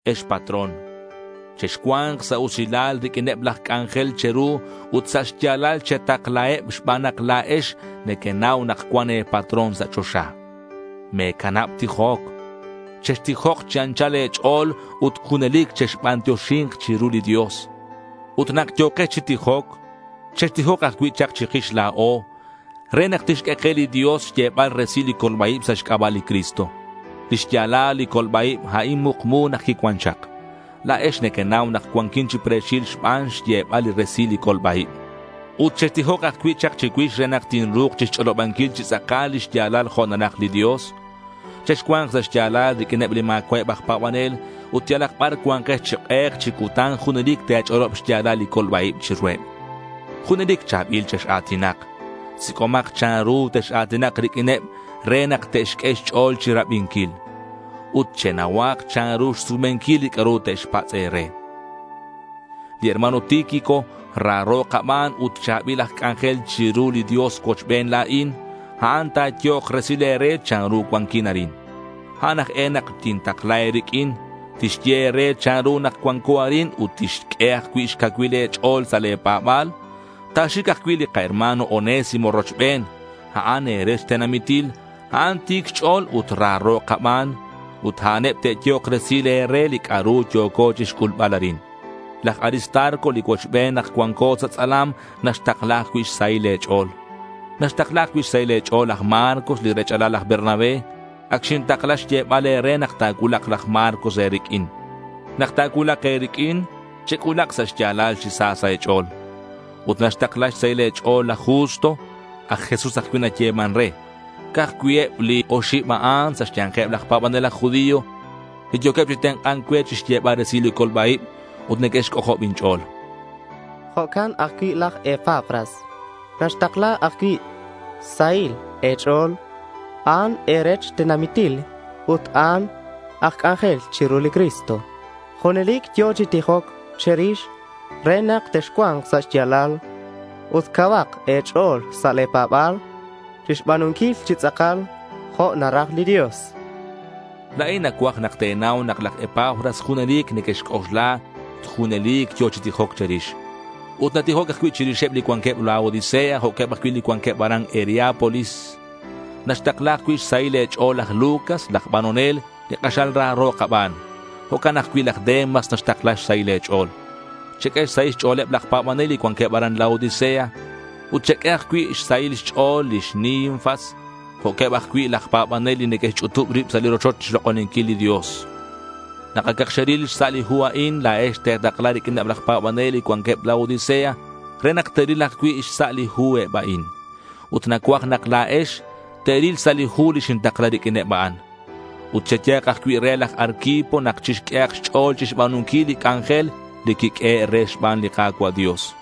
Ex patrón, chexcua̱nk sa' usilal riq'uineb laj c'anjel che̱ru ut sa' xya̱lal chetaklaheb xban nak la̱ex nequenau nak cuan e̱patrón sa' choxa. Me̱canab tijoc. Chextijok chi anchal e̱ch'o̱l ut junelic chexbantioxi̱nk chiru li Dios. Ut nak yo̱kex chi tijoc, chextijok ajcui' chak chikix la̱o re nak tixq'ue ke li Dios xyebal resil li colba-ib sa' xc'aba' li Cristo. Li xya̱lal li colba-ib, a'in mukmu nak quicuan chak. La̱ex nequenau nak cuanquin chi pre̱xil xban xyebal resil li colba-ib. Ut chextijok ajcui' chak chicuix re nak tinru̱k chixch'olobanquil chi tz'akal li xya̱lal jo' naraj li Dios. Chexcua̱nk sa' xya̱lal riq'uineb li ma̱cua'eb aj pa̱banel ut yalak bar cua̱nkex chi k'ek chi cutan junelic te̱ch'olob xya̱lal li colba-ib chiruheb. Junelic cha̱bil chex-a̱tinak. Sic'omak chanru tex-a̱tinak riq'uineb re nak te'xq'ue xch'o̱l chirabinquil. Ut chenauhak chanru xsumenquil li c'a'ru te'xpatz' e̱re. Li hermano Tíquico raro kaban ut cha̱bil aj c'anjel chiru li Dios cuochben la̱in. A'an ta̱yehok resil e̱re chanru cuanquin arin. A'an aj e nak tintakla e̱riq'uin. Tixye e̱re chanru nak cuanco arin ut tixq'ue ajcui' xcacuil e̱ch'o̱l sa' le̱ pa̱ba̱l. Ta̱xic ajcui' li kaherma̱n Onésimo rochben. A'an e̱rech tenamitil. A'an ti̱c xch'o̱l ut raro kaban. Ut a'aneb te'yehok resil e̱re li c'a'ru yo̱co chixc'ulbal arin. Laj Aristarco li cuochben nak cuanco sa' tz'alam naxtakla ajcui' xsahil e̱ch'o̱l. Naxtakla ajcui' xsahil e̱ch'o̱l laj Marcos li rech'alal laj Bernabé. Ac xintakla xyebal e̱re nak ta̱cuulak laj Marcos e̱riq'uin. Nak ta̱cuulak e̱riq'uin, chec'ulak sa' xya̱lal chi sa sa' e̱ch'o̱l. Ut naxtakla xsahil e̱ch'o̱l laj Justo. Aj Jesús ajcui' nayeman re. Ca'aj eb cui' li oxib a'an sa' xya̱nkeb laj pa̱banel aj judío li yo̱queb chi tenk'a̱nc cue chixyebal resil li colba-ib. Ut neque'xc'ojob inch'o̱l. Jo'can ajcui' laj Epafras naxtakla ajcui' xsahil e̱ch'o̱l. A'an e̱rech tenamitil ut a'an aj c'anjel chiru li Cristo. Junelic yo̱ chi tijoc che̱rix re nak texcua̱nk sa' xya̱lal ut cauhak e̱ch'o̱l sa' le̱ pa̱ba̱l chixba̱nunquil chi tz'akal jo' naraj li Dios. La̱in nacuaj nak te̱nau nak laj Epafras junelic nequexc'oxla ut junelic yo̱ chi tijoc che̱rix. Ut natijoc ajcui' chirixeb li cuanqueb Laodicea jo'queb ajcui' li cuanqueb aran Hierápolis. Naxtakla ajcui' xsahil e̱ch'o̱l laj Lucas, laj banonel li k'axal raro kaban. Jo'can ajcui' laj Demas naxtakla xsahil e̱ch'o̱l. Cheq'ue xsahil xch'o̱leb laj pa̱banel li cuanqueb aran Laodicea. Ut cheq'ue ajcui' xsahil xch'o̱l li xNinfas, jo'queb ajcui' laj pa̱banel li neque'xch'utub rib sa' li rochoch chixlok'oninquil li Dios. Nak acak xeril xsa' li hu a'in la̱ex, te̱takla riq'uineb laj pa̱banel li cuanqueb Laodicea, re nak te'ril ajcui' xsa' li hu eb a'an. Ut nacuaj nak la̱ex te̱ril xsa' li hu li xintakla riq'uineb a'an. Ut cheyehak ajcui' re laj Arquipo nak chixq'uehak xch'o̱l chixba̱nunquil li c'anjel li quiq'uehe' re xban li Ka̱cua' Dios.